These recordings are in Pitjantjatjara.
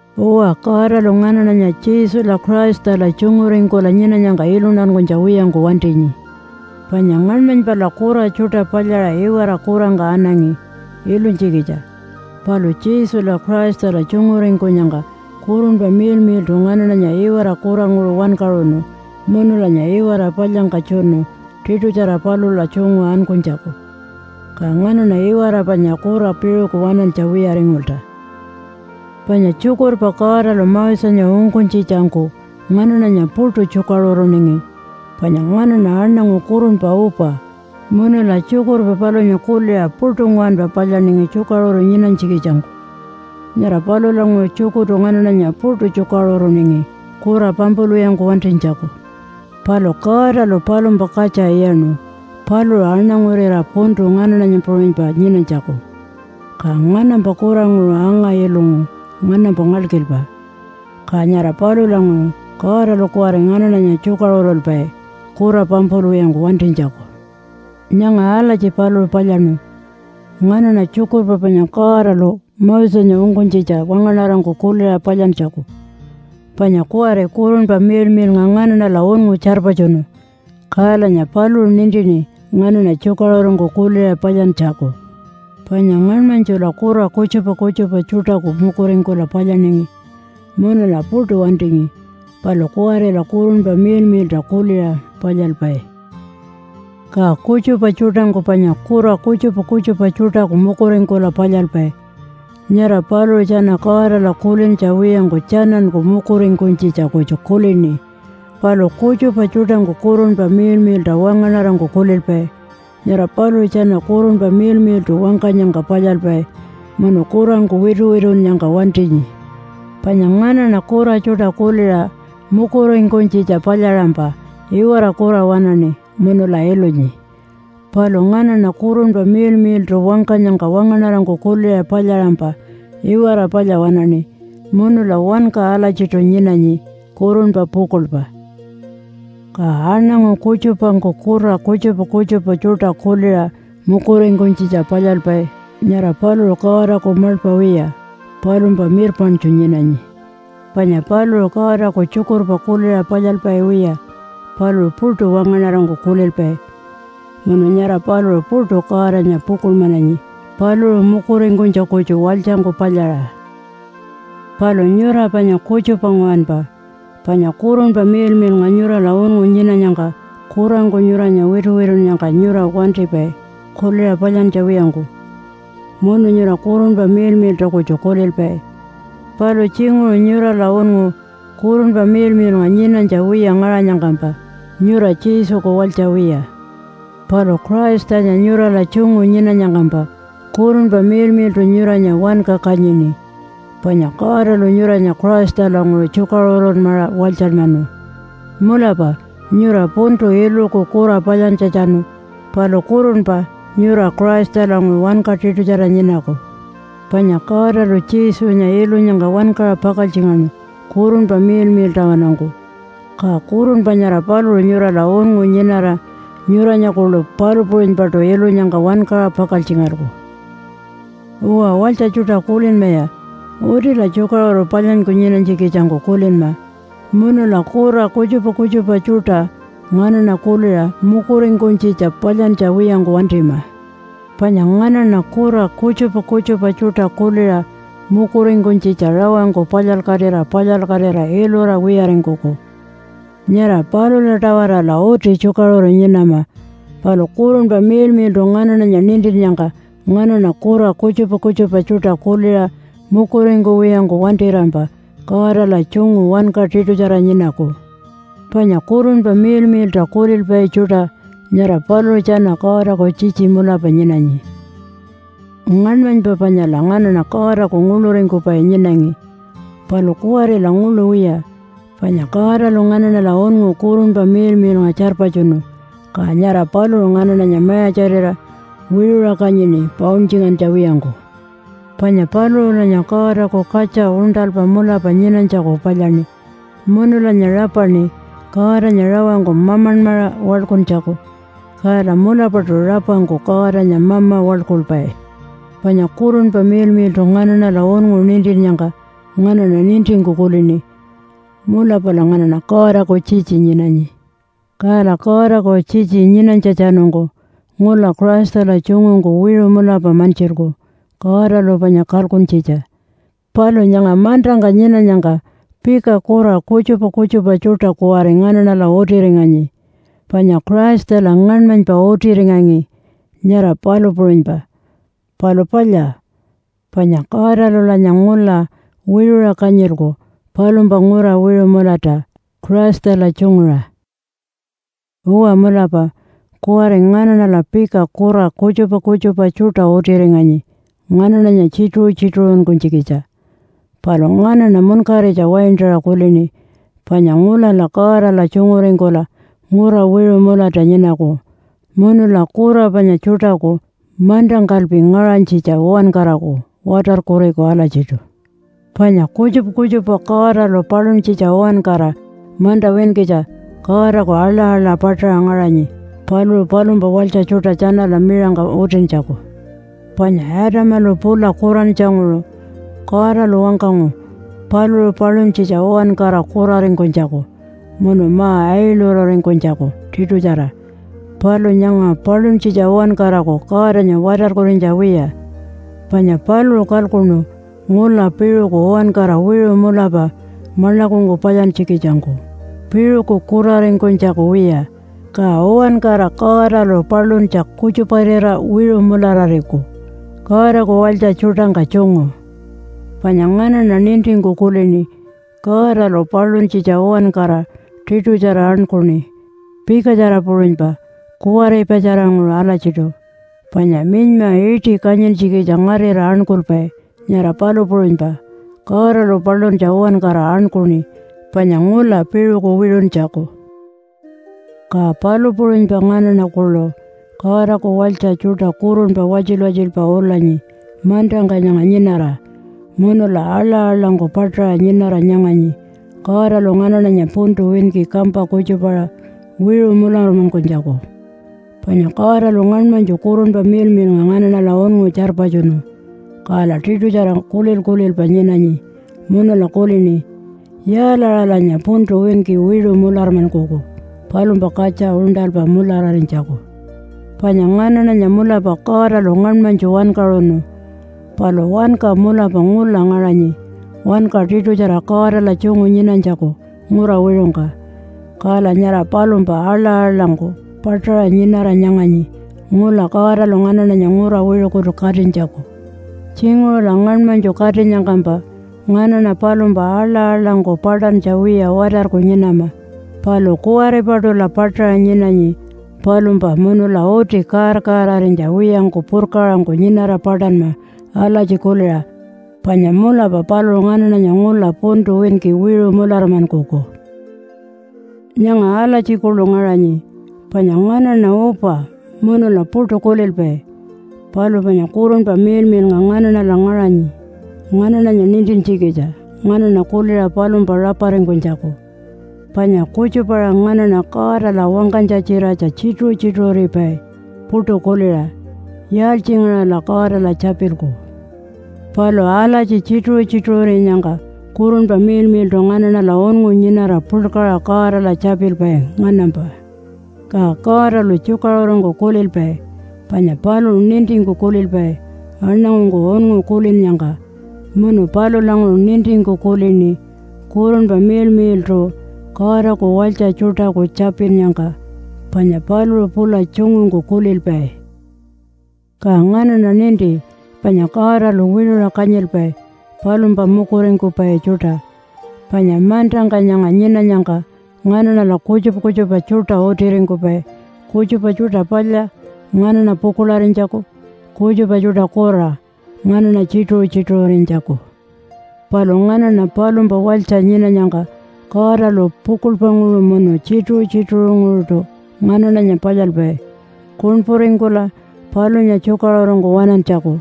Uwa, Godalu nganaṉanya Jesula Christala tjunguringkula nyinanyangka iluntankunytja wiyangku wantinyi. Panya ngaṉmanypala kura tjuṯa palyaṟa iwara kurangka anangi ilunytjikitja. Palu Jesula Christala tjunguringkunyangka Kurunpa Miḻmiḻṯu nganaṉanya iwara kuranguṟu wankaṟunu munulanya iwara palyangka tjunu tiṯutjara palula tjungu ankunytjaku. Ka nganaṉa iwara panya kura piṟuku waṉantja wiyaringulta. Panya tjukurpa Godalu Mosenya ungkunytjitjangku nganaṉanya puṯu tjukaṟuruningi, panya nganaṉa aṉangu kurunpa upa munula tjukurpa palunya kuliṟa puṯu nguwanpa palyaningi tjukaṟuru nyinanytjikitjangku. Nyara palulanguṟu tjukurtu nganaṉanya puṯu tjukaṟuruningi kura pampulwiyangku wantinytjaku. Palu Godalu palumpa katja iyaṉu paluṟu aṉangurira puntu nganaṉanya puṟunypa nyinanytjaku, ka nganampa kuranguṟu anga-ilungu nganampa ngalkilpa. Ka nyara palulanguṟu Godalu kuwari nganaṉanya tjukaṟurulpai kura pampulwiyangku wantinytjaku. Nyanga alatji paluṟu palyaṉu nganaṉa tjukurpa panya Godalu Mosenya ungkunytjitja wangaṉarangku kuliṟa palyantjaku. Panya kuwari Kurunpa Miḻmiḻnga nganaṉala unngu tjarpatjunu, kalanya paluṟu nintini nganaṉa tjukaṟurungku kuliṟa palyantjaku. Panya ngaṉmanytjula kura kutjupa kutjupa tjuṯaku mukuringkula palyaningi munula puṯu wantingi. Palu kuwarila Kurunpa Miḻmiḻṯa kuliṟa palyalpai. Ka kutjupa tjuṯangku panya kura kutjupa kutjupa tjuṯaku mukuringkula palyalpai, nyara paluṟu tjana Godala kulintja wiyangku tjananku mukuringkunytjitja kutju kulini. Palu kutjupa tjuṯangku Kurunpa Miḻmiḻṯa wangaṉarangku kulilpai, nyara paluṟu tjana Kurunpa Miḻmiḻṯu wangkanyangka palyalpai munu kurangku wituwitunnyangka wantinyi. Panya nganaṉa kura tjuṯa kuliṟa mukuringkunytjitja palyaṟampa iwara kura waṉaṉi munula ilunyi. Palu nganaṉa Kurunpa Miḻmiḻṯu wangkanyangka wangaṉarangku kuliṟa palyaṟampa iwara palya waṉaṉi, munula wanka alatjiṯu nyinanyi kurunpa pukuḻpa. Ka aṉangu kutjupangku kura kutjupa kutjupa tjuṯa kuliṟa mukuringkunytjitja palyalpai, nyara paluṟu Godaku maḻpa wiya, palumpa mirpaṉtju nyinanyi. Panya paluṟu Godaku tjukurpa kuliṟa palyalpai wiya. Paluṟu puṯu wangaṉarangku kulilpai, munu nyara paluṟu puṯu Godanya pukuḻmananyi paluṟu mukuringkunytja kutju walytjangku palyaṟa. Palu nyura panya kutjupa nguwanpa, panya Kurunpa Miḻmiḻnga nyurala unngu nyinanyangka kurangku nyuranya wituwitunnyangka nyura wantipai kuliṟa palyantja wiyangku, munu nyura Kurunpa Miḻmiḻṯa kutju kulilpai. Palu tjinguṟu nyurala unngu Kurunpa Miḻmiḻnga nyinanytja wiya ngaṟanyangkampa nyura Jesuku walytja wiya. Palu Christanya nyurala tjungu nyinanyangkampa Kurunpa Miḻmiḻṯu nyuranya wanka kanyini, panya Godalu nyuranya Christalanguṟu tjukaṟurunmaṟa walytjanmanu. Mulapa nyura puntu iluku kura palyantjatjanu, palu kurunpa nyura Christalanguṟu wanka tiṯutjara nyinaku. Panya Godalu Jesunya ilunyangka wankaṟa pakaltjingaṉu Kurunpa Miḻmiḻṯawanungku, ka Kurunpa nyara paluṟu nyurala unngu nyinara nyuranya kuḻu palu puṟunypaṯu ilunyangka wankaṟa pakaltjingalku. Uwa walytja tjuṯa, kulinmaya! Utila tjukaṟuru palyanyku nyinanytjikitjangku kulinma munula kura kutjupa kutjupa tjuṯa nganaṉa kuliṟa mukuringkunytjitja palyantja wiyangku wantima. Panya nganaṉa kura kutjupa kutjupa tjuṯa kuliṟa mukuringkunytjitja rawangku palyalkatira palyalkatira ilura wiyaringkuku. Nyara palula-tawarala uti tjukaṟuru nyinama. Palu Kurunpa Miḻmiḻṯu nganaṉanya nintinnyangka nganaṉa kura kutjupa kutjupa tjuṯa kuliṟa mukuringkuwiyangku wantirampa Godala tjungu wanka tiṯutjara nyinaku. Panya Kurunpa Miḻmiḻṯa kulilpai tjuṯa, nyara paluṟu tjana Godaku tjitji mulapa nyinanyi. Ngaṉmanypa panyala nganaṉa Godaku nguḻuringkupai nyinangi. Palu kuwarila nguḻu wiya, panya Godalu nganaṉala unngu Kurunpa Miḻmiḻnga tjarpatjunu, ka nyara paluṟu nganaṉanya mayatjarira wiṟuṟa kanyini pauntjingantja wiyangku. Panya paluṟulanya Godaku katja uṉṯalpa mulapa nyinanytjaku palyaṉi, munulanya rapaṉi Godanya rawangku Mamanmaṟa waḻkuntjaku. Kala mulapaṯu rapangku Godanya mama waḻkulpai. Panya Kurunpa Miḻmiḻṯu nganaṉala unngu nintinnyangka nganaṉa nintingku kulini, “Mulapala nganaṉa Godaku tjitji nyinanyi.” Kala Godaku tjitji nyinanytjatjanungku ngula Christala tjungungku wiṟu mulapa mantjilku Godalu panya kalkuntjitja. Palu nyanga mantangka nyinanyangka pika kura kutjupa kutjupa tjuṯa kuwari nganaṉala utiringanyi panya Christala ngaṉmanypa utiringangi, nyara palu puṟunypa. Palu palya, panya Godalulanya ngula wiṟuṟa kanyilku palumpa ngura wiṟu mulata Christala tjunguṟa. Uwa mulapa kuwari nganaṉala pika kura kutjupa kutjupa tjuṯa utiringanyi nganaṉanya tjituṟu-tjituṟunkunytjikitja. Palu nganaṉa munkaritja waintaṟa kulini, panya ngulala Godala tjunguringkula ngura wiṟu mulata nyinaku, munula kura panya tjuṯaku mantangkalpi ngaṟanytjitja uwankaraku watarkuriku alatjiṯu. Panya kutjupa kutjupa Godalu paluntjitja uwankara manta winkitja Godaku aḻa-aḻa paṯaṟa ngaṟanyi paluṟu palumpa walytja tjuṯa tjanala miṟangka utintjaku. Panya Adamalu pula kurantjanguṟu, Godalu wangkangu paluṟu paluntjitja uwankara kuraringkunytjaku munu ma-ailururingkunytjaku tiṯutjara. Palu nyanga paluntjitja uwankaraku Godanya watarkurinytja wiya, panya paluṟu kalkuṉu ngula piṟuku uwankara wiṟu mulapa maḻakungku palyantjikitjangku piṟuku kuraringkunytjaku wiya. Ka uwankara Godalu paluntja kutjuparira wiṟu mularariku Godaku walytja tjuṯangka tjungu. Panya nganaṉa nintingku kulini Godalu paluntjitja uwankara tiṯutjara aṉkuṉi pikatjara puṟunypa kuwaripatjaranguṟu alatjiṯu. Panya minyma iṯi kanyintjikitja ngarira aṉkulpai, nyara palu puṟunypa Godalu paluntja uwankara aṉkuṉi panya ngula piṟuku wiṟuntjaku. Ka palu puṟunypa nganaṉa kuḻu Godaku walytja tjuṯa kurunpa watjil-watjilpa ulanyi mantangka nyanga nyinara, munula aḻa-aḻangku paṯaṟa nyinara nyanganyi Godalu nganaṉanya puntu winki kampa kutjupaṟa wiṟu mularmankunytjaku. Panya Godalu ngaṉmanytju Kurunpa Miḻmiḻnga nganaṉala unngu tjarpatjunu, kala tiṯutjara kulil-kulilpa nyinanyi, munula kulini, “Yaalaṟalanya puntu winki wiṟu mularmankuku palumpa katja uṉṯalpa mulararinytjaku.” Panya nganaṉanya mulapa Godalu ngaṉmanytju wankaṟunu, palu wanka mulapa ngula ngaṟanyi wanka tiṯutjara Godala tjungu nyinanytjaku ngura wiṟungka. Kala nyara palumpa aḻa-aḻangku paṯaṟa nyinara nyanganyi ngula Godalu nganaṉanya ngura wiṟukutu katinytjaku. Tjinguṟula ngaṉmanytju katinyangkampa nganaṉa palumpa aḻa-aḻangku paṯantja wiya watarku nyinama. Palu kuwaripaṯula paṯaṟa nyinanyi palumpa munula uti kaar-kaararinytja wiyangku purkaṟangku nyinara paṯanma alatji kuliṟa, “Panya mulapa paluṟu nganaṉanya ngula puntu winki wiṟu mularmankuku.” Nyanga alatji kuḻu ngaṟanyi, panya nganaṉa upa munula puṯu kulilpai. Palu panya Kurunpa Miḻmiḻnga nganaṉala ngaṟanyi nganaṉanya nintintjikitja nganaṉa kuliṟa palumpa raparingkunytjaku. Panya kutjupa-aṟa nganaṉa Godala wangkanytja-tjiratja tjituṟu-tjituṟuripai puṯu kuliṟa, “Yaaltjingaṟala Godala tjapilku?” Palu alatji tjituṟu-tjituṟurinyangka Kurunpa Miḻmiḻṯu nganaṉala unngu nyinara puḻkaṟa Godala tjapilpai nganampa. Ka Godalu tjukaṟurungku kulilpai. Panya paluṟu nintingku kulilpai aṉangungku unngu kulinnyangka, munu palulanguṟu nintingku kulini Kurunpa Miḻmiḻṯu Godaku walytja tjuṯaku tjapinnyangka, panya paluṟu pula tjungungku kulilpai. Ka nganaṉa ninti panya Godalu wiṟuṟa kanyilpai palumpa mukuringkupai tjuṯa. Panya mantangka nyanga nyinanyangka nganaṉala kutjupa kutjupa tjuṯa utiringkupai, kutjupa tjuṯa palya nganaṉa pukuḻarinytjaku, kutjupa tjuṯa kura nganaṉa tjituṟu-tjituṟurinytjaku. Palu nganaṉa palumpa walytja nyinanyangka Godalu pukuḻpanguṟu munu tjituṟu-tjituṟunguṟuṯu nganaṉanya palyalpai kuṉpuringkula palunya tjukaṟurungku waṉantjaku.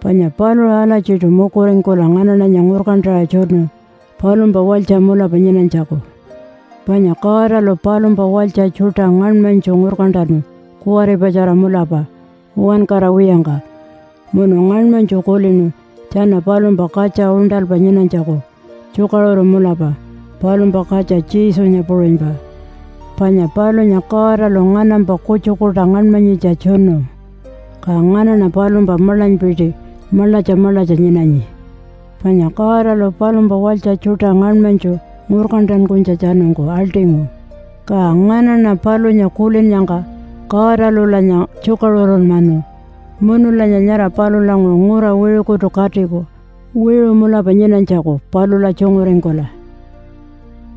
Panya paluṟu alatjiṯu mukuringkula nganaṉanya ngurkantaṟa tjunu palumpa walytja mulapa nyinanytjaku. Panya Godalu palumpa walytja tjuṯa ngaṉmanytju ngurkantanu kuwaripatjara mulapa uwankara wiyangka, munu ngaṉmanytju kulinu tjana palumpa katja uṉṯalpa nyinanytjaku tjukaṟuru mulapa palumpa katja Jesunya puṟunypa. Panya palunya Godalu nganampa kutjukuṯa ngaṉmanyitja tjunu, ka nganaṉa palumpa maḻanypiti maḻatja maḻatja nyinanyi. Panya Godalu palumpa walytja tjuṯa ngaṉmanytju ngurkantankunytjatjanungku aḻṯingu, ka nganaṉa palunya kulinnyangka Godalulanya tjukaṟurunmanu. Munulanya nyara palulanguṟu ngura wiṟukutu katiku wiṟu mulapa nyinanytjaku palula tjunguringkula.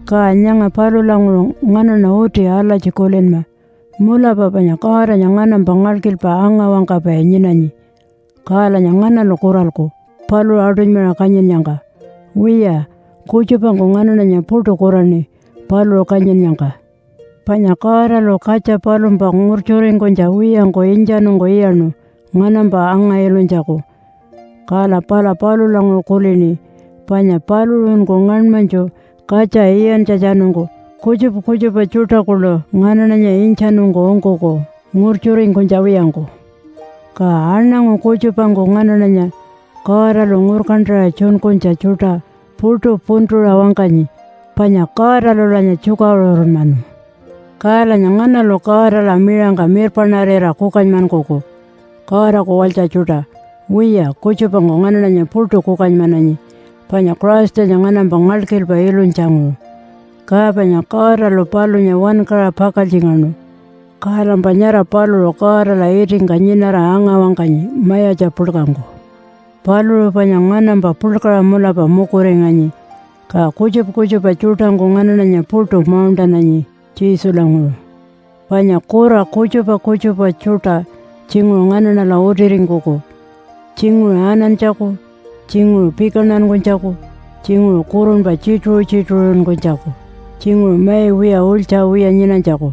Ka nyanga palulanguṟu nganaṉa uti alatji kulinma mulapa panya Godanya nganampa ngalkilpa anga-wangkapai nyinanyi, kalanya nganalu kuralku paluṟu aṯunymaṟa kanyinnyangka? Wiya, kutjupangku nganaṉanya puṯu kuraṉi paluṟu kanyinnyangka. Panya Godalu katja palumpa ngurtjuringkunytja wiyangku intjanungku iyaṉu nganampa anga-ilunytjaku. Kala pala palulanguṟu kulini, panya paluṟunku ngaṉmanytju katja iyantjatjanungku kutjupa kutjupa tjuṯa kuḻu nganaṉanya intjanungku ungkuku ngurtjuringkunytja wiyangku. Ka aṉangu kutjupangku nganaṉanya Godalu ngurkantaṟa tjunkunytja tjuṯa puṯu puntuṟa wangkanyi, panya Godalulanya tjukaṟurunmanu. Kalanya nganalu Godala miṟangka mirpaṉarira kukanymankuku Godaku walytja tjuṯa? Wiya kutjupangku nganaṉanya puṯu kukanymananyi, panya Christanya nganampa ngalkilpa ilunytjanguṟu, ka panya Godalu palunya wankaṟa pakaltjingaṉu, kalampa nyara paluṟu Godala itingka nyinara anga-wangkanyi mayatja puḻkangku. Paluṟu panya nganampa puḻkaṟa mulapa mukuringanyi. Ka kutjupa kutjupa tjuṯangku nganaṉanya puṯu mauṉṯananyi Jesulanguṟu. Panya kura kutjupa kutjupa tjuṯa tjinguṟu nganaṉala utiringkuku, tjinguṟu anantjaku, tjinguṟu pikantankunytjaku, tjinguṟu kurunpa tjituṟu-tjituṟuringkunytjaku, tjinguṟu mai wiya ulytja wiya nyinanytjaku,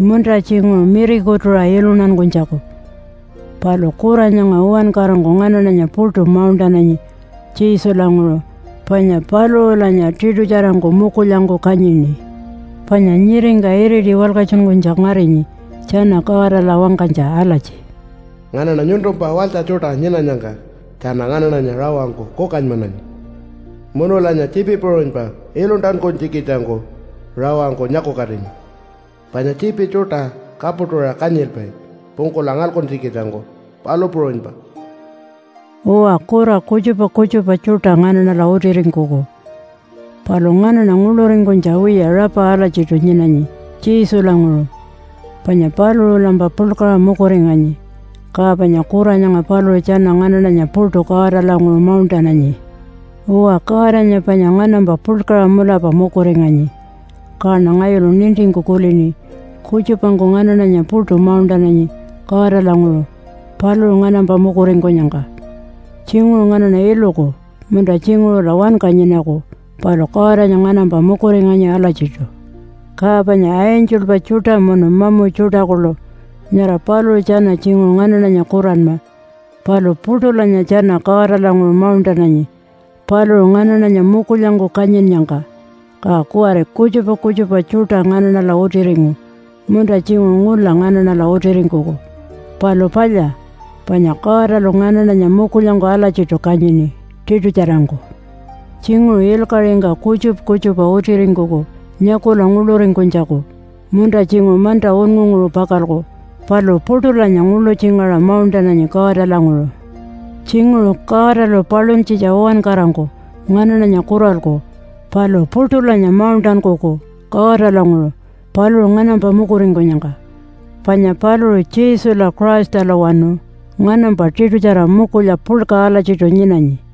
munta tjinguṟu mirikutuṟa iluntankunytjaku. Palu kura nyanga uwankarangku nganaṉanya puṯu mauṉṯananyi Jesulanguṟu panya paluṟulanya tiṯutjarangku mukulyangku kanyini. Panya nyiringka iriti walkatjunkunytja ngarinyi tjana Godala wangkanytja alatji, “Nganaṉa nyuntumpa walytja tjuṯa nyinanyangka tjana nganaṉanya rawangku kukanymananyi. Munulanya tjiipi puṟunypa iluntankunytjikitjangku rawangku nyakukatinyi. Panya tjiipi tjuṯa kapuṯuṟa kanyilpai pungkula ngalkuntjikitjangku, palu puṟunypa.” Uwa, kura kutjupa kutjupa tjuṯa nganaṉala utiringkuku, palu nganaṉa nguḻuringkunytja wiya rapa alatjiṯu nyinanyi Jesulanguṟu, panya paluṟulampa puḻkaṟa mukuringanyi, ka panya kura nyanga paluṟu tjana nganaṉanya puṯu Godalanguṟu mauṉṯananyi. Uwa, Godanya panya nganampa puḻkaṟa mulapa mukuringanyi, kaṉa ngayulu nintingku kulini kutjupangku nganaṉanya puṯu mauṉṯananyi Godalanguṟu paluṟu nganampa mukuringkunyangka. Tjinguṟu nganaṉa iluku munta tjinguṟula wanka nyinaku, palu Godanya nganampa mukuringanyi alatjiṯu. Ka panya angelpa tjuṯa munu mamu tjuṯa kuḻu, nyara paluṟu tjana tjinguṟu nganaṉanya kuranma, palu puṯulanya tjana Godalanguṟu mauṉṯananyi paluṟu nganaṉanya mukulyangku kanyinnyangka. Ka kuwari kutjupa kutjupa tjuṯa nganaṉala utiringu, munta tjinguṟu ngula nganaṉala utiringkuku, palu palya, panya Godalu nganaṉanya mukulyangku alatjiṯu kanyini tiṯutjarangku. Tjinguṟu ilkaṟingka kutjupa kutjupa utiringkuku nyakula nguḻuringkunytjaku munta tjinguṟu manta unngunguṟu pakalku, palu puṯulanya nguḻutjingaṟa mauṉṯananyi Godalanguṟu. Tjinguṟu Godalu paluntjitja uwankarangku nganaṉanya kuralku palu puṯulanya mauṉṯankuku Godalanguṟu paluṟu nganampa mukuringkunyangka. Panya paluṟu Jesula Christalawanu nganampa tiṯutjara mukulya puḻka alatjiṯu nyinanyi.